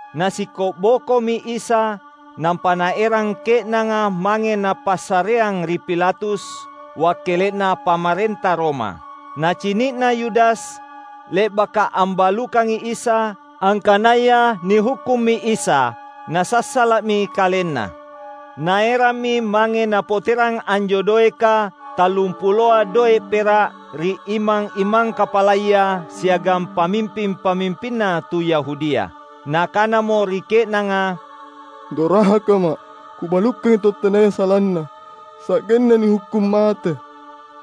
Nasikko’bokomi Isa, nampa naerang ke’nanga mange napassareang ri Pilatus, wakkele’na pamarenta Roma. Nacini’na Yudas, le’baka ambalukangi Isa, angkanaya nihukkummi Isa, nasassala’mi kalenna. Naerammi mange napoterang anjo doeka tallumpuloa doe’ pera’ ri imang-imang kapalaya siagang pamimping-pamimpinna tu Yahudia. Nakanamo ri ke’nanga, "Dorakama’ kubalukangi tau tenaya salanna, sa’genna nihukkung mate!"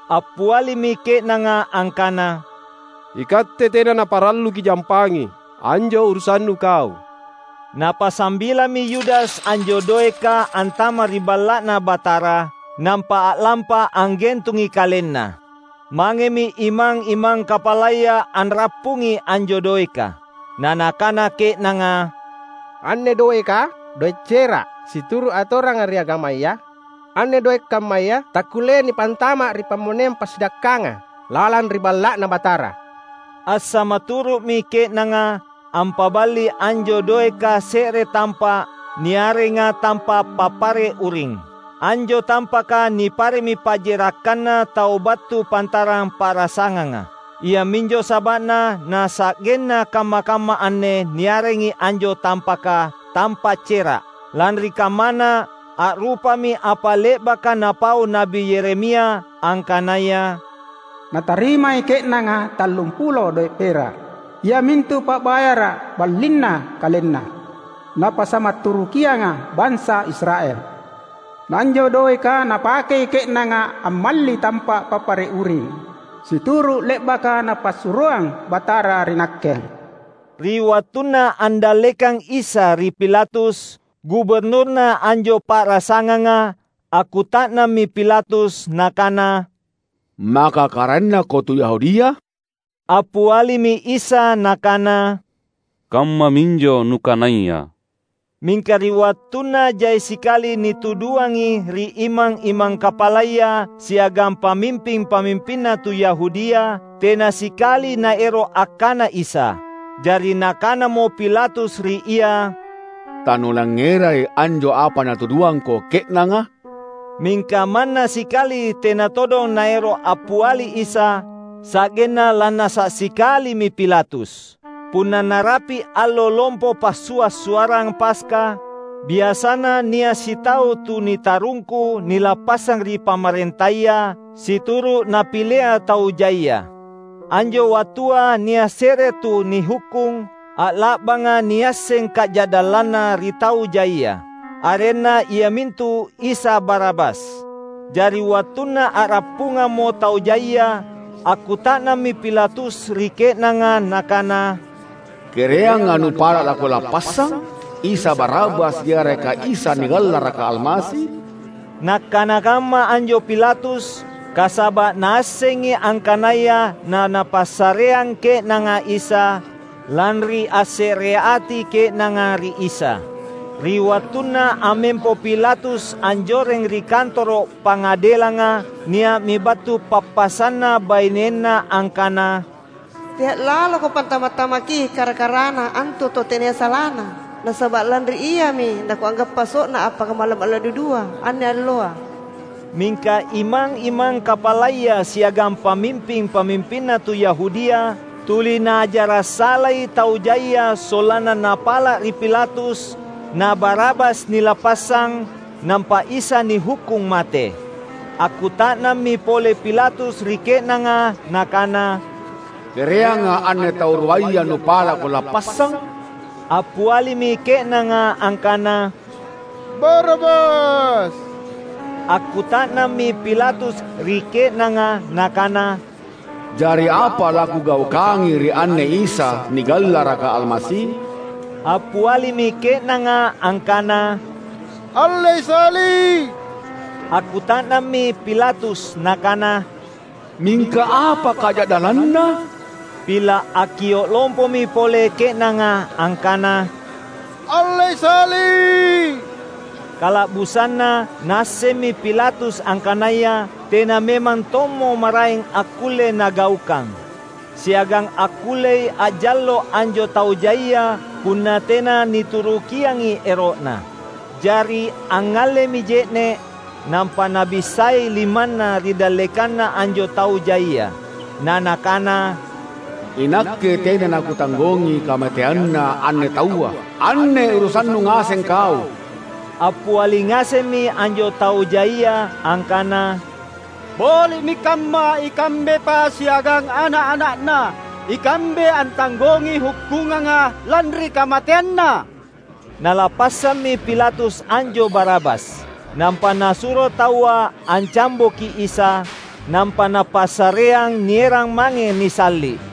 Appialimi ke’nanga angkana, "Ikatte tena naparallu kijampangi; anjo urusannu kau!" Napasambilami Yudas anjo doeka antama’ ri Balla’Na Batara, nampa a’lampa anggentungi kalenna. Mangemi imang-imang kapalaya anrappungi anjo doeka. Na nakana ke’nanga, "Anne doeka, doe’ cera’. Situru’ atoranga ri agamaya, anne doe’ kammaya takkulleai nipantama’ ri pammoneang passidakkanga lalang ri Balla’Na Batara." Assamaturu’mi ke’nanga ampaballi anjo doeka se’re tampa’ niarenga Tampa’ Papare’ Uring. Anjo tampaka nipare’mi pa’jerakkanna tau battu pantarang pa’rasanganga. Iaminjo saba’na na sa’genna kamma-kamma anne niarengi anjo tampaka, "Tampa’ Cera’". Lanri kammana, a’rupami apa le’baka napau Na’bi Yeremia, angkanaya, "Natarimai ke’nanga tallumpulo doe’ pera’, iamintu pa’bayara’ ballinna KalenNa, napassamaturukianga bansa Israel. Na anjo doeka napakei ke’nanga ammalli Tampa’ Papare’ uring, situru’ le’baka Napassuroang Batara ri nakke." Ri wattunna andallekang Isa ri Pilatus, guburnurna anjo pa’rasanganga, akkuta’nammi Pilatus nakana, "Maka karaennaKo tu Yahudia?" Appialimi Isa Nakana, "Kammaminjo nukanaya." Mingka ri wattunna jai sikali nituduangi ri imang-imang kapalaya siagang pamimping-pamimpinna tu Yahudia, tena sikali Naero’ akkana Isa. Jari nakanamo Pilatus ri Ia, "Tanulangngerai anjo apa natuduangKo ke’nanga?" Mingka manna sikali tena todong Naero’ appiali Isa, sa’genna lannasa’ sikalimi Pilatus. Punna narapi’ allo lompo Passua’-suarrang Paska, biasana nia’ sitau tu nitarungku nilappassang ri pamarentaya, situru’ napilea tau jaia. Anjo wattua nia’ se’re tu nihukkung, a’la’banga niasseng kaja’dallanna ri tau jaia. Arenna iamintu Isa Barabas. Jari wattunna a’rappungammo tau jaia, akkuta’nammi Pilatus ri ke’nanga nakana, "Kereanga nupala’ lakulappassang? Isa Barabas yareka Isa nigallaraka Almasi?" Nakkana kamma anjo Pilatus, kasaba’ naassengi angkanaya na napassareang ke’nanga Isa, lanri assereati ke’nanga ri Isa. Ri wattunna ammempo Pilatus anjoreng ri kantoro’ pangadelanga nia’mi battu pappasanna bainenna angkana, "Tea’ laloko pantama’-tamakki kara-karana antu tau tenaya salana. Nasaba’ lanri Iami nakunggappa so’na appakamalla’-malla’ dudua, anne alloa." Mingka imang-imang kapalaya siagang pamimping-pamimpinna tu Yahudia, tuli naajara’ salai tau jaia sollanna napala’ ri Pilatus, na Barabas nilappassang, nampa Isa nihukkung mate. Akkuta’nammi pole Pilatus ri ke’nanga nakana, "Kereanga anne tau ruaya nupala’ kulappassang?" Appialimi ke’nanga angkana, "Barabas!" Akkuta’nammi Pilatus ri ke’nanga nakana, "Jari apa lakugaukangi ri anne Isa, nigallaraka Almasi?" Appialimi ke’nanga angkana, "Allei Salli’!" Akkuta’nammi Pilatus nakana, "Mingka apa kaja’dallanNa?" Pila’ akkio’ lompomi pole ke’nanga angkana, "Allei Salli’!" Kala’busanna naassemmi Pilatus angkanaya tena memang tommo maraeng akkulle nagaukang. Siagang akkullei a’jallo’ anjo tau jaia punna tena niturukiangi ero’na. Jari angngallemi je’ne’, nampa nabissai limanna ri dallekanna anjo tau jaia. Na nakana, "Inakke tena nakutanggongi kamateanNa anne taua! Anne urusannu ngaseng kau!" Appiali ngasemmi anjo tau jaia angkana, "Boli’mi kamma, ikambepa siagang ana’-ana’na ikambe antanggongi hukkunganga lanri kamateanNa!" Nalappassammi Pilatus anjo Barabas. Nampa nasuro taua ancamboki Isa; nampa napassareang nierang mange nisalli’.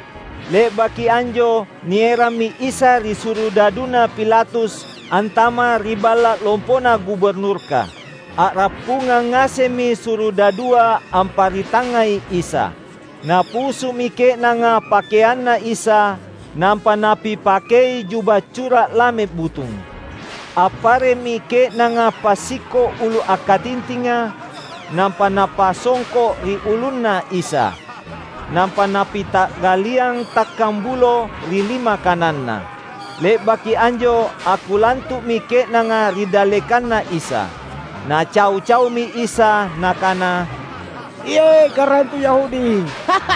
Le’baki anjo nierammi Isa ri surudaduna Pilatus antama’ ri balla’ lompona guburnurka. A’rappungang ngasemmi surudadua amparitangngai Isa. Napusumi ke’nanga pakeanNa Isa, nampa napipakei juba cura’ lame butung. Appare’mi ke’nanga passikko’ ulu akkatintinga, nampa napasongko’ ri ulunNa Isa. Nampa napita’galliang takkang bulo ri lima kananNa. Le’baki anjo akkulantu’mi ke’nanga ri dallekanNa Isa. Nacau-caumi Isa nakana, "Iye’, Karaeng tu Yahudi!"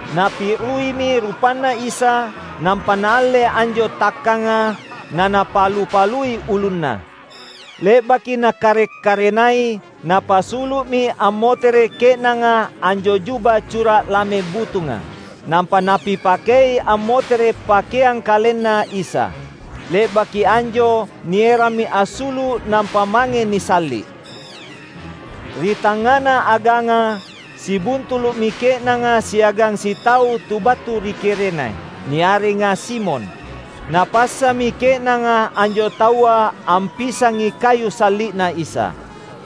Napi’ruimi rupanNa Isa, nampa naalle anjo takkanga, na napalu-palui ulunNa. Le’baki nakarek-karenai, napasulu’mi ammotere’ ke’nanga anjo juba cura’ lame butunga. Nampa napipakei ammotere’ pakeang KalenNa Isa. Le’baki anjo nierammi assulu’ nampa mange nisalli’. Ri tangngana aganga, sibuntulu’mi ke’nanga siagang sitau tu battu ri Kirene, niarenga Simon. Napassami ke’nanga anjo taua ampisangi kayu salli’na Isa.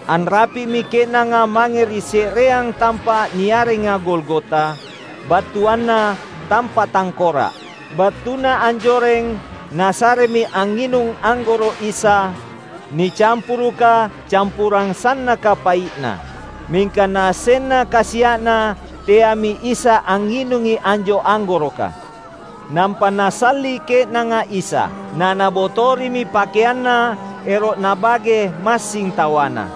Anrapi’mi ke’nanga mange ri se’reang tampa’ niarenga Golgota, battuanna "Tampa’ Tangkora’". Battuna anjoreng nasaremi angnginung anggoro’ Isa, nicampuruka campurang sannaka pai’na. Mingka Naassenna kasia’na teami Isa angnginungi anjo anggoroka. Nampa nasalli’ ke’nanga Isa. Na nabotorimi pakeanNa ero’ nabage massing tawana.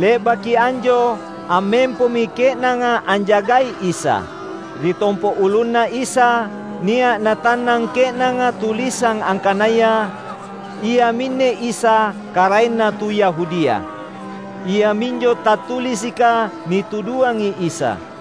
Le’baki anjo ammempomi ke’nanga anjagai Isa. Ri tompo’ ulunNa Isa, nia’ natannang ke’nanga tulisang angkanaya, "Iaminne Isa, Karaenna tu Yahudia". Iaminjo tattulisika nituduangi Isa.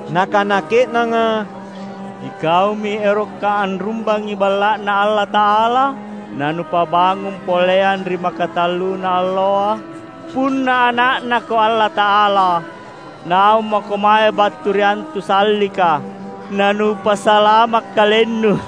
Nakana ke’nanga, "Ikaumi eroka anrumbangi Balla’Na Allata’ala, na nupabangung poleang ri makatalluna alloa! Punna Ana’naKo Allata’ala, naung maKo mae battu ri antu sallika, na Nupasalama’ KalenNu!"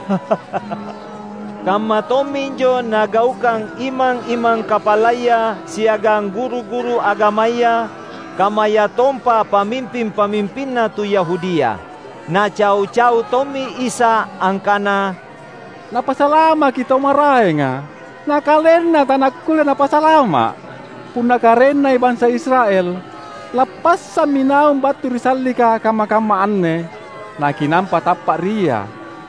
Kamma tomminjo nagaukang imang-imang kapalaya siagang guru-guru agamaya, kammayatompa pamimping-pamimpinna tu Yahudia. Nacau-cau tommi Isa angkana, "Napasalamaki tau maraenga, na KalenNa taNakulle Napasalama’! Punna Karaennai bansa Israel, lappassammi naung battu ri sallika kamma-kamma anne, na kinampa tappa’ ri Ia.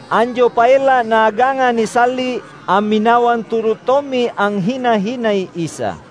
Anjo paella’ Naaganga nisalli’, amminawang turu’ tommi anghina-hinai Isa.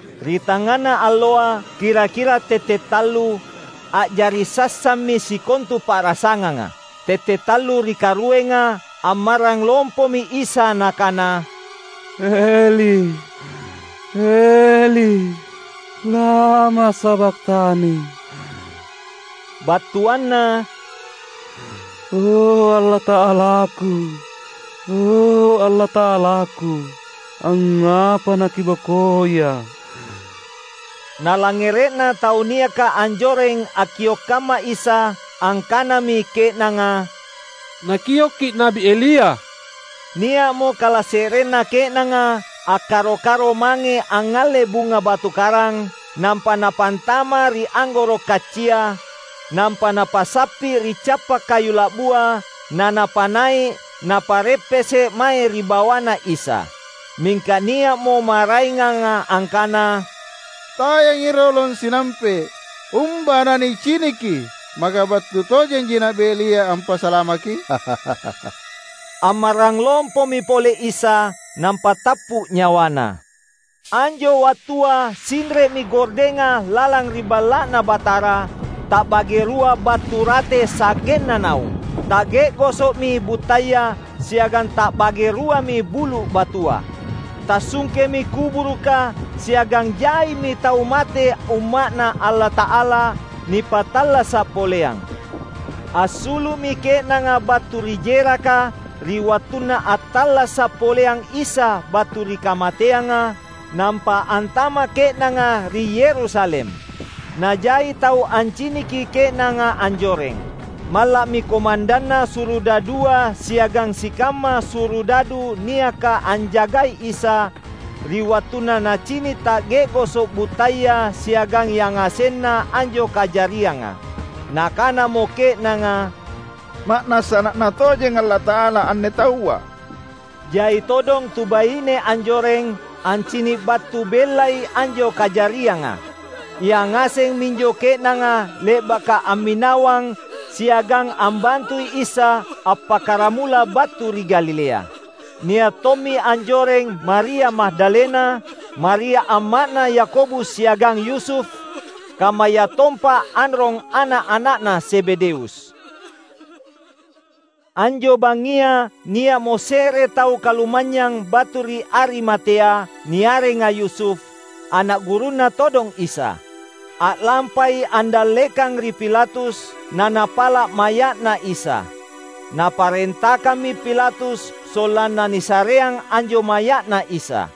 Ri tangngana alloa, kira-kira tallung tette’, a’jari sassammi sikontu pa’rasanganga. Tette’ tallu ri karuenga, ammarrang lompomi Isa Nakana, "Eli, Eli, lama sabakhtani?" battuanna, "O, Allata’alaKu, O, Allata’alaKu, angngapa naKibokoiA’?" Nalangngere’na tau niaka anjoreng akkio’ kamma Isa, angkanami ke’nanga, "Nakioki Na’bi Elia!" Nia’mo kalase’renna ke’nanga akkaro-karo mange angngalle bunga batu karang, nampa napantama’ ri anggoro’ kaccia; nampa napasappi’ ri cappa’ kayu la’bua, na napanai’ napa’reppese’ mae ri bawaNa Isa. Mingka nia’mo maraenganga angkana, "Tayangi rolong sinampe’. Umba na niciniki, maka battu tojenji Na’bi Elia ampasalamaKi?" Ammarrang lompomi pole Isa, nampa tappu’ nyawaNa. Anjo wattua sinre’mi gordenga lalang ri Balla’Na Batara, ta’bage rua battu rate sa’genna naung. Ta’ge’goso’mi buttaya, siagang ta’bage ruami bulu’ batua. Tassungkemi kuburuka, siagang jaimi tau mate umma’Na Allata’ala nipattallasa’ poleang. Assulu’mi ke’nanga battu ri jeraka ri wattunna attallasa’ poleang Isa battu ri kamateanga, nampa antama’ ke’nanga ri Yerusalem. Na jai tau anciniki ke’nanga anjoreng. Malla’mi komandanna surudadua siagang sikamma surudadu niaka anjagai Isa, ri wattunna nacini’ ta’ge’goso’ buttaya siagang yangasenna anjo kajarianga. Nakanamo ke’nanga, "Ma’nassa Ana’Na tojeng Allata’ala anne Taua!" Jai todong tu baine anjoreng, ancini’ battu bellai anjo kajarianga. Ia ngaseng minjo ke’nanga le’baka amminawang siagang ambantui Isa appakkaramula battu ri Galilea. Nia’ tommi anjoreng Maria Magdalena, Maria amma’na Yakobus siagang Yusuf, kammayatompa anrong ana’-ana’na Zebedeus. Anjo bangngia nia’mo se’re tau kalumanynyang battu ri Arimatea niarenga Yusuf, ana’ gurunNa todong Isa. A’lampai andallekang ri Pilatus, na napala’ maya’na Isa. Na parentakammi Pilatus sollanna nisareang anjo maya’Na Isa.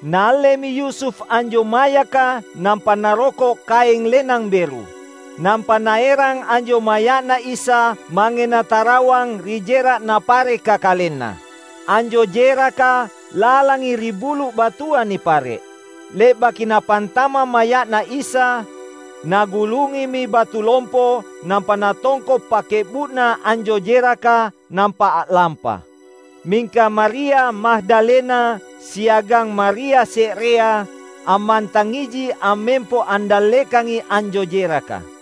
Naallemi Yusuf anjo mayaka nampa naroko’ kaeng lenang beru. Nampa naerang anjo maya’Na Isa mange natarawang ri jera’ napareka kalenna. Anjo jeraka lalangi ri bulu’ batua nipare’. Le’baki napantama’ maya’Na Isa, nagulungimi batu lompo nampa natongko’ pakke’bu’na anjo jeraka, nampa a’lampa. Mingka Maria Magdalena siagang Maria se’rea, ammantangiji ammempo andallekangi anjo jeraka.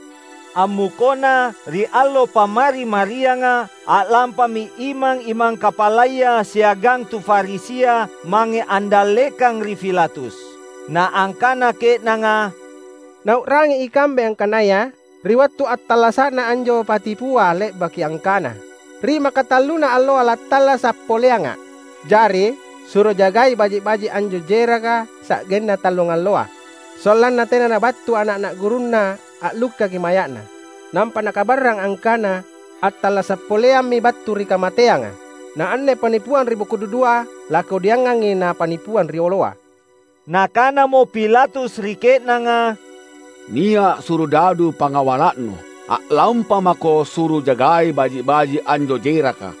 Ammukona, ri allo Pammari-marianga, a’lampami imang-imang kapalaya siagang tu Farisia mange andallekang ri Pilatus. Na angkana ke’nanga, "Nau’rangi ikambe angkanaya ri wattu attallasa’na anjo patipua le’baki angkana, ‘Ri makatalluna alloa lattallasa’ poleangA’.’ Jari suro jagai baji’-baji’ anjo jeraka sa’genna tallungalloa, sollanna tena nabattu ana’-ana’ gurunNa allukkaki maya’Na, nampa nakabarrang angkana attallasa’ poleammi battu ri kamateanga. Na anne pannipuang ri boko dudua lakodiangangi na pannipuang rioloa." Nakanamo Pilatus ri ke’nanga, "Nia’ surudadu pangawala’nu. A’lampamako suro jagai baji’-baji’anjo jeraka."